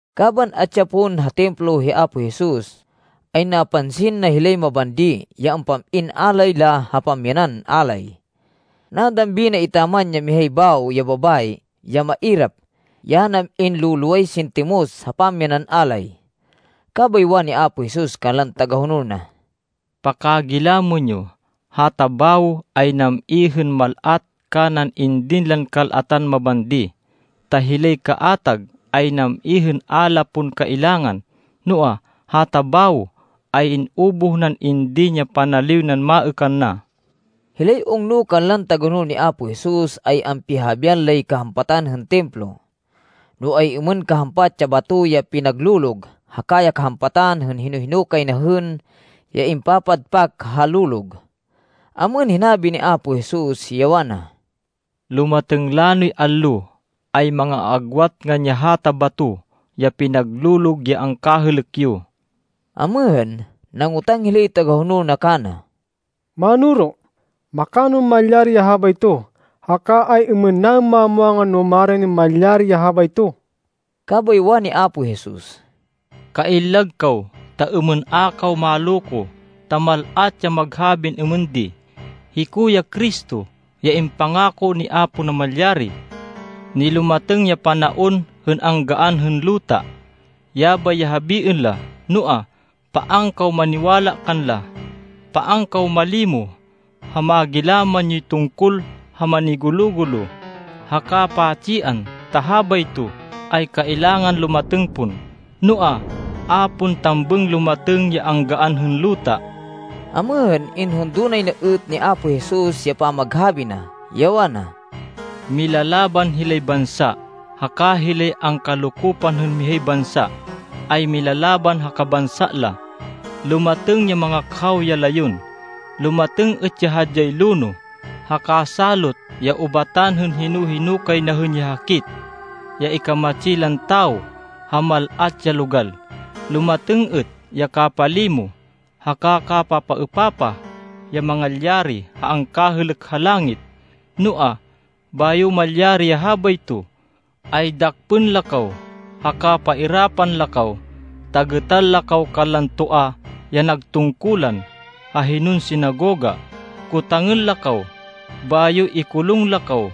Kaban atsi ya pon ha Templo hi Apo Jesus, ay napansin na hilay mabandi, ya ampam-in alay la ha pamyanan alay. Nadambi na etaman ya mihay bawo ya babayi, ya mairap, ya nam-in lo-loway sintimos ha pamyanan alay. Kabay wani Apo Jesus kanlan tagahonol na, “Pakagilamên yo, hata bawo ay nam-i hên mal-at kanan indin lan kal-atan mabandi. Ta hilay kaatag ay nam-i hên a la pon kailangan, noa, hata bawo ay in-ubuh nan indin ya panaliw nan maêkan na.” Hilay ungno kanlan tagahonol ni Apo Jesus ay ampihahabian lay kahampatan hên Templo. No ay-êmên kahampat ya bato ya pinaglolog haka ya kahampatan hên hino-hino kay na hên ya impapadpak ha lolog. Amêhên, hinabi ni Apo Jesus, ya wana, “Lumatêng lanoy allo, ay manga-aagwat ngan ya hata bato ya pinaglolog ya angkahêlêk yo.” Amêhên, nangotang hilay tagahonol na kana, “Mánoro, makanon malyari ya habayto, haka ay-êmên naên mamwangan no maranin malyari ya habayto?” Kabay wani Apo Jesus, “Kaillag kaw, ta êmên a kaw maloko, ta mal-at ya maghabin êmên di, ‘Hiko ya Cristo ya impangako ni Apo Namalyari. Nilumatêng ya panaon hên anggaan hên luta.’ Yabay ya habiên la, noa, paan kaw maniwala kanla. Paan kaw malimo ha magilaman yoy tungkol ha manigulo-gulo haka pa-tsian, ta habayto ay kailangan lumatêng pon, noa, a pon tambêng lumatêng ya anggaan hên luta.” Amêhên, inhundo nay na êt ni Apo Jesus ya pamaghabi na, ya wana, “Milalaban hilay bansa haka hilay angkalokopan hên mihay bansa ay milalaban ha kabansa la. Lumatêng ya mangakhaw ya layon. Lumatêng êt ya hadyay lonoh haka salot ya ubatan hên hino-hino kay na hên ya hakit ya ikamatsi lan tawo ha mal-at ya logal. Lumatêng êt ya kapalimo haka kapapaêpapah ya mangalyari ha angkahêlêk ha langit. “Noa, bayo malyari ya habayto, ay dakpên la kaw, haka pairapan la kaw, ta gêtan la kaw kanlan toa ya nag tungkulan ha hinon sinagoga, kotangên la kaw, bayo ikulung la kaw.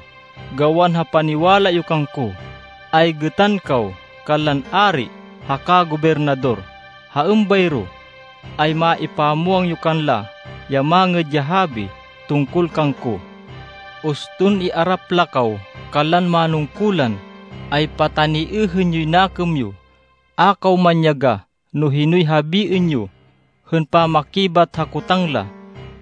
Gawan ha paniwala yo kangko, ay gêtan kaw kanlan ari haka gobernador. Ha êmbayro ay maipamwang yo kanla ya Mangêd ya Habi tungkol kangko. Uston iarap la kaw kanlan manungkulan, ay pataniêhên yoy nakêm yo. A kaw manyagah no hinoy habiên yo hên pamakibat ha kotang la,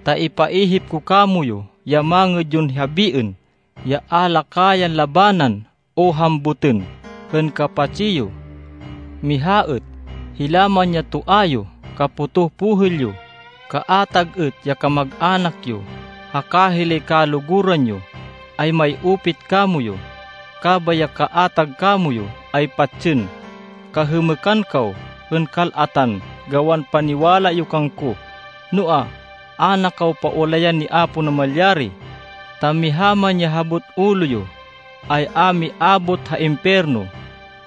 ta ipaihip ko kamoyu ya mangêd yon habiên, ya a la kayan labanan o hambutên hên kapatsi yo. Miha êt, hila man ya toa yo, kapotoh pohêl yo, kaatag êt ya kamag-anak yo, haka hilay kaluguran yo ay may-upit kamoyu, kabay ya kaatag kamoyu ay patsên. Kahêmêkan kaw hên kal-atan gawan paniwala yo kangko. Noa, a na kaw paulayan ni Apo Namalyari, ta miha man ya habot ulo yo, ay a miabot ha impiyerno.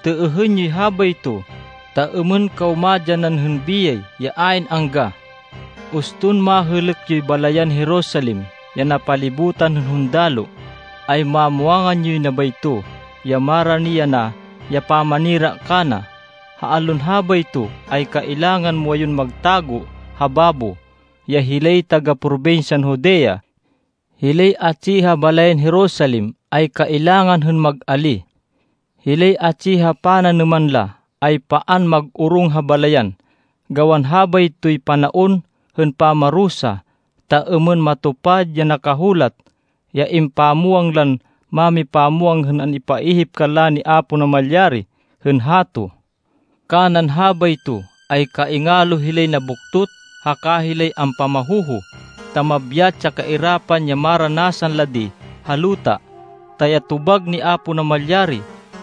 Têêhên yoy habayto, ta êmên kaw madyanan hên biyay ya ayn angga.” “Uston mahêlêk yoy balayan Jerusalem ya napalibutan hên hundaloh, ay mamwangan yoy na bayto ya marani yana ya pamanira kana. Ha allon habayto ay kailangan muwayun magtago ha babo, ya hilay taga-probinsyan Judea. Hilay atsi ha balayan Jerusalem ay kailangan hên mag-alíh. Hilay atsi ha pananêman la, ay paan mag-orong ha balayan. Gawan habaytoy panaon hên pamarusa, ta êmên matupad ya nakahulat, ya impamwang lan mámipamwang hên an-ipaihip kanla ni Apo Namalyari hên hato. Kanan habayto, ay kaingalo hilay nabuktot haka hilay ampamahoho, ta mabyat ya kairapan ya maranasan la di ha luta, ta ya tobag ni Apo Namalyari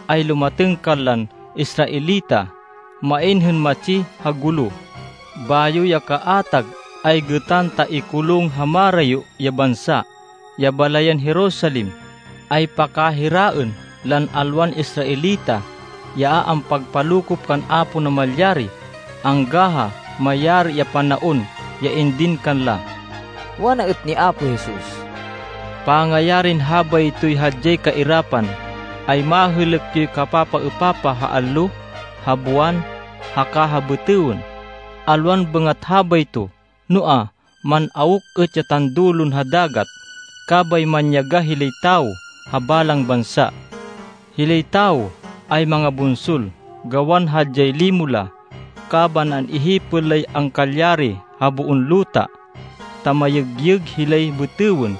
ay lumatêng kanlan Israelita. Main hên matsi ha gulo, bayo ya kaatag ay gêtan ta ikulung ha marayo ya bansa. Ya balayan Jerusalem ay pakahiraên lan alwan Israelita, ya a ampagpalokop kan Apo Namalyari, angga ha mayari ya panaon ya indin kanla.” Wana êt ni Apo Jesus, “Pangayarin habaytoy hadyay kairapan, ay mahêlêk yoy kapapaêpapah ha allo, ha buwan, haka ha bêtêwên. Alwan bêngat habayto, noa, man-awk êt ya tandulon ha dagat kabay manyagah hilay tawo ha balang bansa. Hilay tawo ay mangabunsol, gawan hadyay limo la kaban an-ihipên lay angkalyari ha boon luta, ta mayêgyêg hilay bêtêwên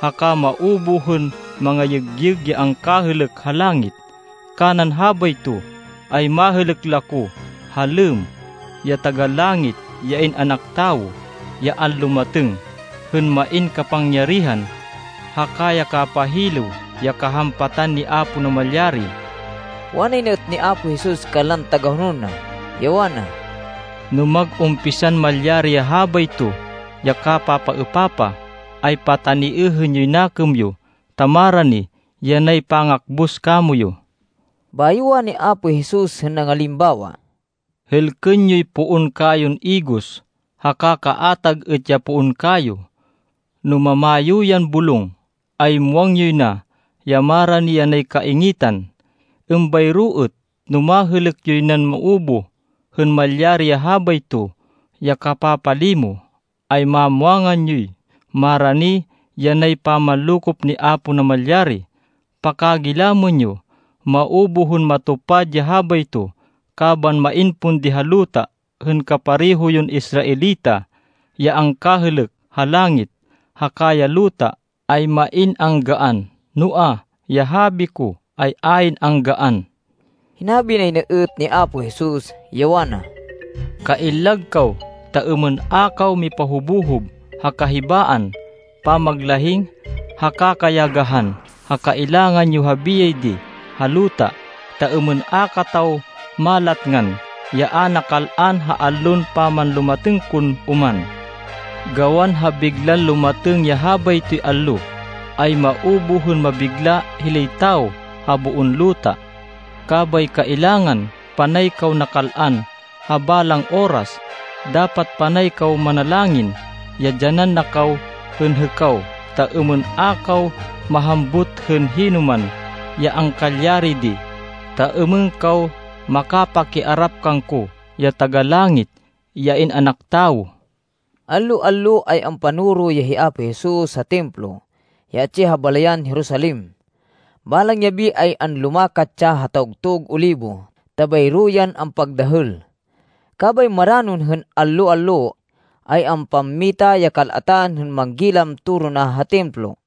haka maubuh hên mangayêgyêg ya angkahêlêk ha langit. Kanan habayto, ay mahêlêk la ko ha lêmm, ya Taga-Langit, ya In-anak Tawo, ya anlumatêng, hên main kapangyarihan, haka ya kapahilêw ya kahampatan ni Apo Namalyari.” Wanay na êt ni Apo Jesus kanlan tagahonol na, ya wana, “No mag-umpisan malyari ya habayto ya kapapaêpapah, ay pataniêhên yoy nakêm yo, ta marani yanay pangakbus kamoyu.” Bayo wani Apo Jesus hên nangalimbawa, “Hêlkên yoy poon kayon igos, haka kaatag êt ya poon kayo. No mamayo yan bulong, ay muwang yoy na ya marani yanay kaingitan. Êmbayro êt, no mahêlêk yoy nan maubuh hên malyari ya habayto ya kapapalimo, ay mamwangan yoy marani yanay pamanlokop ni Apo Namalyari. Pakagilamên yo. Maubuh hên matupad ya habayto kaban main pon di ha luta hên kapareho yon Israelita. Ya angkahêlêk ha langit, haka ya luta ay main anggaan, noa, ya habi ko ay ayn anggaan.” Hinabi nay na êt ni Apo Jesus, ya wana, “Kaillag kaw ta êmên a kaw mipahobohob ha kahibaan, pamaglahing, haka kayagahan ha kailangan yo ha biyay di ha luta. Ta êmên a kataw malatngan ya a nakal-an ha allon pamanlumatêng kon oman. Gawan ha biglan lumatêng ya habaytoy allo, ay maubuh hên mabigla hilay tawo ha boon luta. Kabay kailangan panay kaw nakal-an ha balang oras. Dapat panay kaw manalangin ya dyanan na kaw hên hêkaw, ta êmên a kaw mahambut hên hinoman ya angkalyari di, ta êmên kaw makapakiarap kangko, ya Taga-Langit, ya In-anak Tawo.” Allo-allo ay ampanoro ya hi Apo Jesus ha Templo ya atsi ha balayan Jerusalem. Balang yabi ay anlumakat ya ha Tawgtug Olibo ta bayro yan ampagdahêl. Kabay maranon hên allo-allo, ay ampammita ya kal-atan, hên manggilam toro na ha Templo.